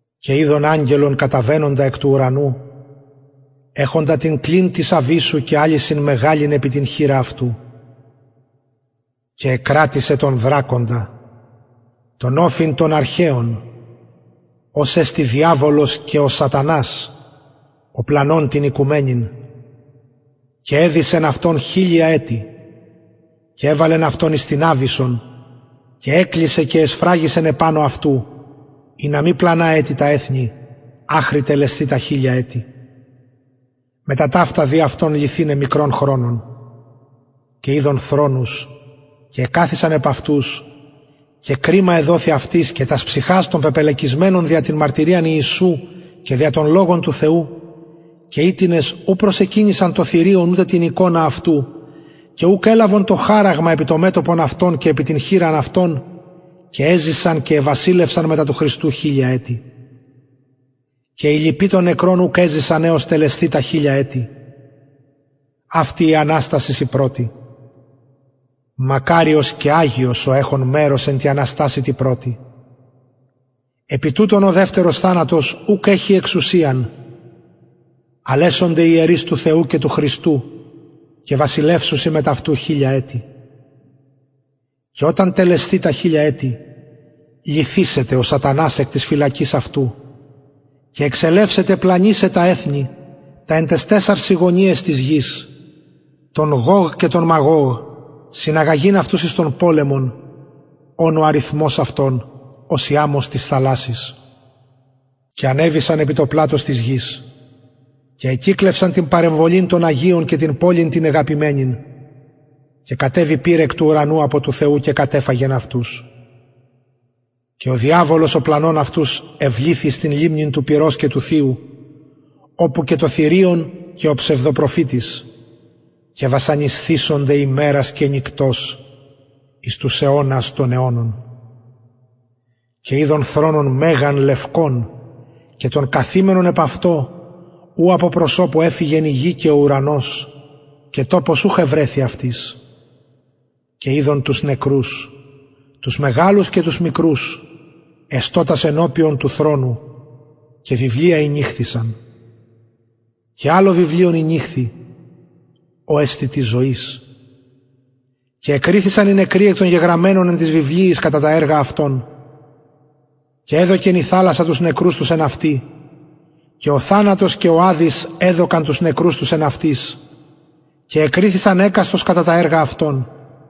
και ειδον αγγελον καταβαινοντα εκ του ουρανου εχοντα την κλειν της αβυσσου και αλυσιν μεγαλην επι την χειρα αυτου και εκρατησεν τον δρακοντα τον οφιν τον αρχαιον ος εστιν διαβολος και ο σατανας ο πλανων την οικουμενην ολην και εδησεν αυτον χιλια ετη και εβαλεν αυτον εις την αβυσσον και εκλεισεν και εσφραγισεν επανω αυτου ινα μη πλανα ετι τα εθνη αχρι τελεσθη τα χιλια ετη και μετα ταυτα δει αυτον λυθηναι μικρον χρονον και ειδον θρονους και εκαθισαν επ αυτους και κριμα εδοθη αυτοις και τας ψυχας των πεπελεκισμενων δια την μαρτυριαν ιησου και δια τον λογον του θεου και οιτινες ου προσεκυνησαν το θηριον ουδε την εικονα αυτου και ουκ ελαβον το χαραγμα επι το μετωπον και επι την χειρα αυτων και εζησαν και εβασιλευσαν μετα του χριστου τα χιλια ετη και οι λοιποι των νεκρων ουκ εζησαν αχρι τελεσθη τα χιλια ετη αυτη η αναστασις η πρωτη μακαριος και αγιος ο εχων μερος εν τη αναστασει τη πρωτη επι τουτων ο δευτερος θανατος ουκ εχει εξουσιαν αλλ εσονται ιερεις του θεου και του χριστου και βασιλευσουσιν μετ αυτου χιλια ετη και οταν τελεσθη τα χιλια ετη λυθησεται ο σατανας εκ της φυλακης αυτου και εξελευσεται πλανησαι τα εθνη τα εν ταις τεσσαρσιν γωνιαις της γης τον γωγ και τον μαγωγ συναγαγειν αυτους εις τον πολεμον ων ο αριθμος ως η αμμος της θαλασσης και ανεβησαν επι το πλατος της γης και εκυκλωσαν την παρεμβολην των αγιων και την πολιν την ηγαπημενην και κατεβη πυρ εκ του ουρανου απο του θεου και κατεφαγεν αυτους και ο διαβολος ο πλανων αυτους εβληθη εις την λιμνην του πυρος και θειου οπου και το θηριον και ο ψευδοπροφητης και βασανισθησονται ημερας και νυκτος εις τους αιωνας των αιωνων και ειδον θρονον μεγαν λευκον και τον καθημενον επ αυτον ου απο προσωπου εφυγεν η γη και ο ουρανος και τοπος ουχ ευρεθη αυτοις και ειδον τους νεκρους τους μεγαλους και τους μικρους εστωτας ενωπιον του θρονου και βιβλια ηνεωχθησαν και αλλο βιβλιον ηνεωχθη ο εστιν της ζωης και εκριθησαν οι νεκροι εκ των γεγραμμενων εν τοις βιβλιοις κατα τα εργα αυτων και εδωκεν η θαλασσα τους νεκρους τους εν αυτη και ο θανατος και ο αδης εδωκαν τους νεκρους τους εν αυτοις και εκριθησαν εκαστος κατα τα εργα αυτων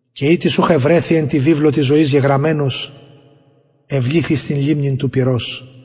και ει τις ουχ ευρεθη εν τω βιβλιω της ζωης γεγραμμενος εβληθη εις την λιμνην του πυρος